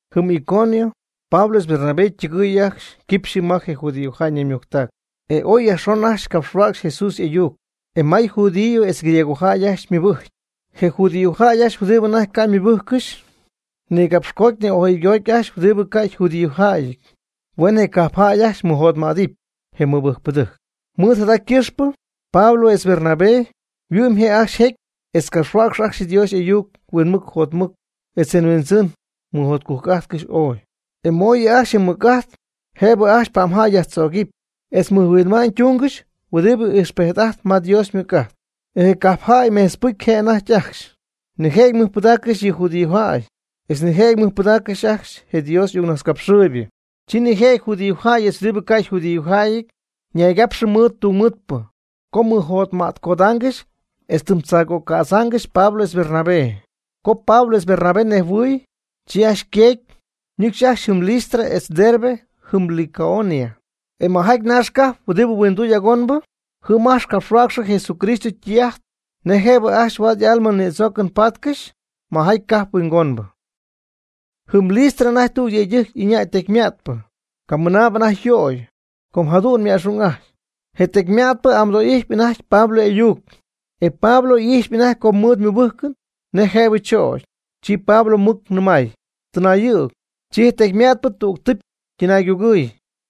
Jɨm Iconio Pablo etz Bernabé ytɨgɨɨy ajcxy yquipxyɨ ma je judíojäy ñaymujctac, e oy yajxon ajcxy capxhuäcxy Jesús y'ayuc. E may judío etz griegojäy ajcxy ymɨbɨjcy. Je judíojäy ajcxy huɨdibɨ anajty ca' ymɨbɨjccɨxy nigapxcoty ni'ojɨygoty ajcxy huɨdibɨ ca' yjudíojäyɨty huen je cajp jäy ajcxy mɨjotmädɨpy je mɨbɨjcpɨdɨjc. Mɨɨd jada ycɨxpɨ Pablo etz Bernabé yhuɨ'my je' ajcxy jecy etz capxhuäcxcɨxy ajcxy Dios y'ayuc huinmɨc jotmɨc etz je Huindzɨn mɨjotcujc'ajtcɨxy ooy, e mooyɨ ajcxy je mɨc'ajt jëbɨ ajcxy pa'mjäy yajtzögɨpy etz mɨjhuinma'ñ tungɨxy huɨdibɨ ijxpejt'ajtp ma Dios ymɨc'ajt. E je cajpjäy mejtzpɨcy je' anajty ajcxy, nijëjɨty ymɨjpɨdacpy ajcxy yɨ judíojäy, etz nijëjɨty ymɨjpɨdacpy ajcxy je Dios y'ayuccapxhuäcxpɨ. Chi nijëjɨty judíojäy etz huɨdibɨ ca' yjudíojäyɨty ñaygapxɨ mɨɨd tungmɨɨdpɨ co mɨjotmätcodaangɨxy etz tɨm tzaagögädzaangɨxy Pablo etz Bernabé. Co Pablo etz Bernabé nejhuɨɨy, chi ajcxy yqueecy ñɨcxy ajcxy jɨm Listra etz Derbe jɨm Licaonia, e majaty naax cajp huɨdi huinduy'agonbɨ. Jɨm ajcxy capxhuäcxy Jesucristo ytɨy'ajt nej jëbɨ ajcxy huaad y'alma nïdzoocɨn paatcɨxy majaty cajp huingonbɨ. Jɨm Listra anajty tüg yëydɨjc ɨñäy tecyma'tpɨ, camɨnaabɨ anajty yöy, com jadu'n anajty yma'xung'aty. Je tecyma'tpɨ amɨdo'ijtpy anajty Pablo y'ayuc, e Pablo ijxpy anajty co ymɨɨd mɨbɨ́jcɨn nej jëbɨ chögy. Chi Pablo mɨc nɨmay: ―Tɨnaayɨ̈g. Chi je tecyma'tpɨ tüg tɨpy ytɨnaygugɨɨy,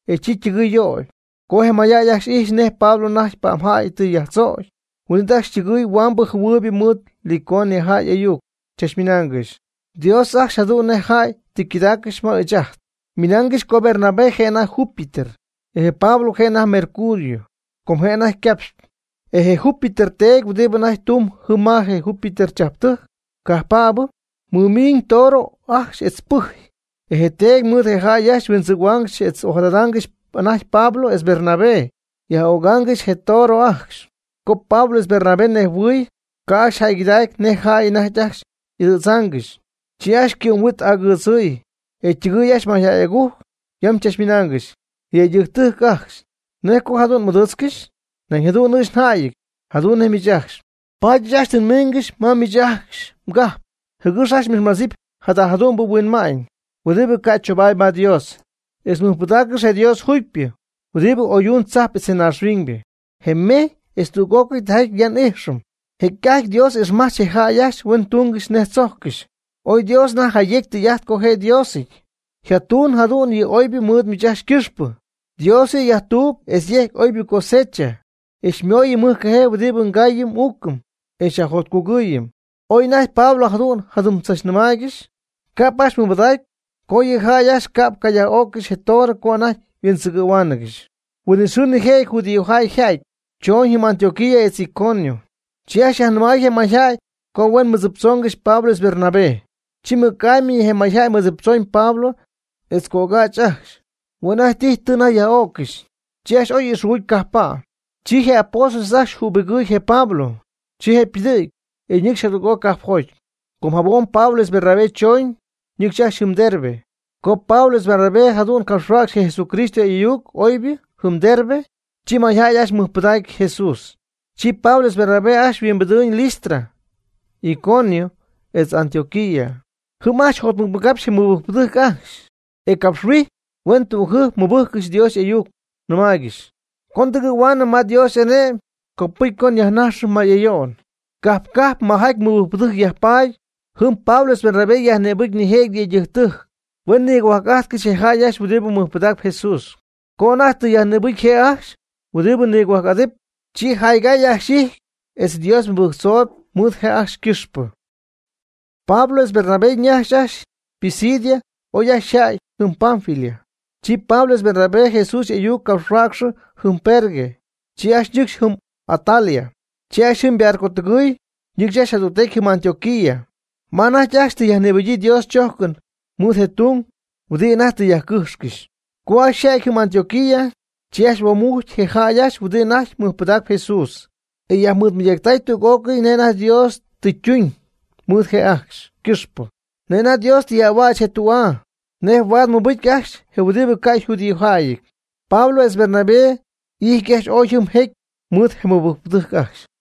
e chi ytɨgɨɨy yöyb. Co je mayjäy ajcxy ijxy nej Pablo anajty pa'mjäy tɨ yajtzögy, huin'it ajcxy ytɨgɨɨy huambɨ jɨhuɨɨybɨ mɨɨd Licaonia ayuc chachmɨnaangɨxy: ―¡Dios ajcxy jadu'n nej jäy tɨ ycɨdaaccɨxy ma ɨɨch ajt! Ymɨnaangɨxy co Bernabé je' anajty Júpiter, e je Pablo je' anajty Mercurio, com je' anajty capxp. E je Júpiter teedy huɨdibɨ anajty tumb jɨm ma je Júpiter chajptɨjc cajppäbɨ, mɨmiiñ toro ajcxy etz pɨjy. E je teedy mɨɨd je jäy ajcxy yhuindzɨgɨ̈huaangɨxy etz ojadadaangɨxy anajty Pablo etz Bernabé, yaj'ögaangɨxy je toro ajcxy. Co Pablo etz Bernabé nejhuɨɨy, ca' ajcxy jäygɨdacy nej jäy anajty ajcxy y'ɨdɨ̈dzaangɨxy, chi ajcxy cɨ'm yhuit agɨɨdzɨɨy, e ytɨgɨɨy ajcxy mayjäy'agujc yam chachmɨnaangɨxy: ―¡Yëydɨjctɨjc ajcxy! ¿Nej co jada jadu'n m'ɨdɨɨtzcɨxy? Nañ jadu'n ɨɨch ajcxy jäyɨty, jadu'n nej miich ajcxy. Paady ɨɨch ajcxy tɨ nmingɨxy ma miich ajcxy mgajp jɨgɨx ajcxy m'ixmadzɨpy jada jadu'mbɨ huinma'ñ huɨdibɨ ca' choobaady ma Dios. E mɨjpɨdaaccɨxp je Dios juugypɨ huɨdi oyduñ tzajp etz naaxhuiñybɨ, je mejy etz tüg'ócɨy tijaty ya n'íjxɨm. Jecy'ajty Dios ixmajch je jäy ajcxy huen túngɨxy nej tzojccɨxy. Oy Dios anajty jayecy tɨy'ajt co je' Diosɨty, jatuñ jadu'n yɨ oybɨ mɨɨd miich ajcxy ycɨxpɨ. Dios yɨ' yajtuub etz yecy oybɨ cosecha e xymooyɨm mɨjcajee huɨdi ngaayɨm n'uucɨm e xyajjotcugɨɨyɨm. Oy anajty Pablo jadu'n jadɨm tzachnɨmaaygɨxy, ca'p ajcxy mɨmadacy co yɨ jäy ajcxy ca'p yaj'ó'ccɨxɨpy je toro co anajty yhuindzɨgɨ̈huaangɨxy. Huin'it xɨɨ nijëjɨty judíojäy yja'ty, chooñ jɨm Antioquía etz Iconio. Chi ajcxy yajnɨmay je mayjäy co huen mɨdziptzoongɨxy Pablo etz Bernabé. Chi mɨc'amy je mayjäy mɨdziptzooñ Pablo etz cögäch ajcxy. Hue' ajcxy tijy tɨ anajty yaj'öccɨxy. Chi ajcxy oy ixjugucy cajppa'. Chi je apóstoles ajcxy jübigɨɨy je Pablo, chi je' ypɨdɨ̈gy, e ñɨcxy jadüg'oc cajpjoty. Com jabom Pablo etz Bernabé chooñ, ñɨcxy ajcxy jɨm Derbe. Co Pablo etz Bernabé jadu'n capxhuäcxy je Jesucristo y'ayuc oybɨ jɨm Derbe, chi mayjäy ajcxy mɨjpɨdacy Jesús. Chi Pablo etz Bernabé ajcxy yhuimbijty Listra, Iconio, etz Antioquía. Jɨm ajcxy jotmɨcmɨgapxy je mɨbɨjcpɨdɨjc ajcxy, e capxhuijy huen tügjɨjp mɨbɨjccɨxy Dios y'ayuc, nɨmaaygɨxy: ―Co ndɨgɨ̈huaanɨm ma Dios y'ane'my copɨcy co nyajnájxɨm may ayo'n. Cajp cajp majaty mɨbɨjcpɨdɨjc yajpaady jɨm Pablo etz Bernabé yajnïbɨjcy nijëjɨty yëydɨjctɨjc huen nigohuajc'ajtcɨxy je jäy ajcxy huɨdibɨ mɨjpɨdacp Jesús. Co anajty tɨ yajnïbɨcy je' ajcxy huɨdibɨ nigohuajc'adɨpy, chi jaygay ajcxy y'ijty etz Dios mɨbɨjctzoy mɨɨd je' ajcxy ycɨxpɨ. Pablo etz Bernabé ñajxy ajcxy Pisidia oy ajcxy yja'ty jɨm Panfilia. Chi Pablo etz Bernabé Jesús y'ayuc capxhuäcxɨ jɨm Perge, chi ajcxy ñɨcxy jɨm Atalia. Chi ajcxy jɨm ybarcotɨgɨɨy ñɨcxcɨxy jadügtecy jɨm Antioquía ma anajty ajcxy tɨ yajnïbɨgyii Dios chójcɨn mɨɨd je tung huɨdibɨ anajty tɨ yajcɨ́jxcɨxy. Co ajcxy yja'ty jɨm Antioquía, chi ajcxy huoomujcy je jäy ajcxy huɨdibɨ anajty mɨjpɨdaacp Jesús, e yajmɨɨdmɨydactay tüg'ócɨy nej anajty Dios tɨ ytuñ mɨɨd je' ajcxy ycɨxpɨ, nej anajty Dios tɨ yaj'ahuäch je tü'aa nej huaad mɨbɨcy ajcxy je huɨdibɨ ca' yjudíojäyɨty. Pablo etz Bernabé ijt ajcxy ooy jɨm jecy mɨɨd je mɨbɨjcpɨdɨjc ajcxy.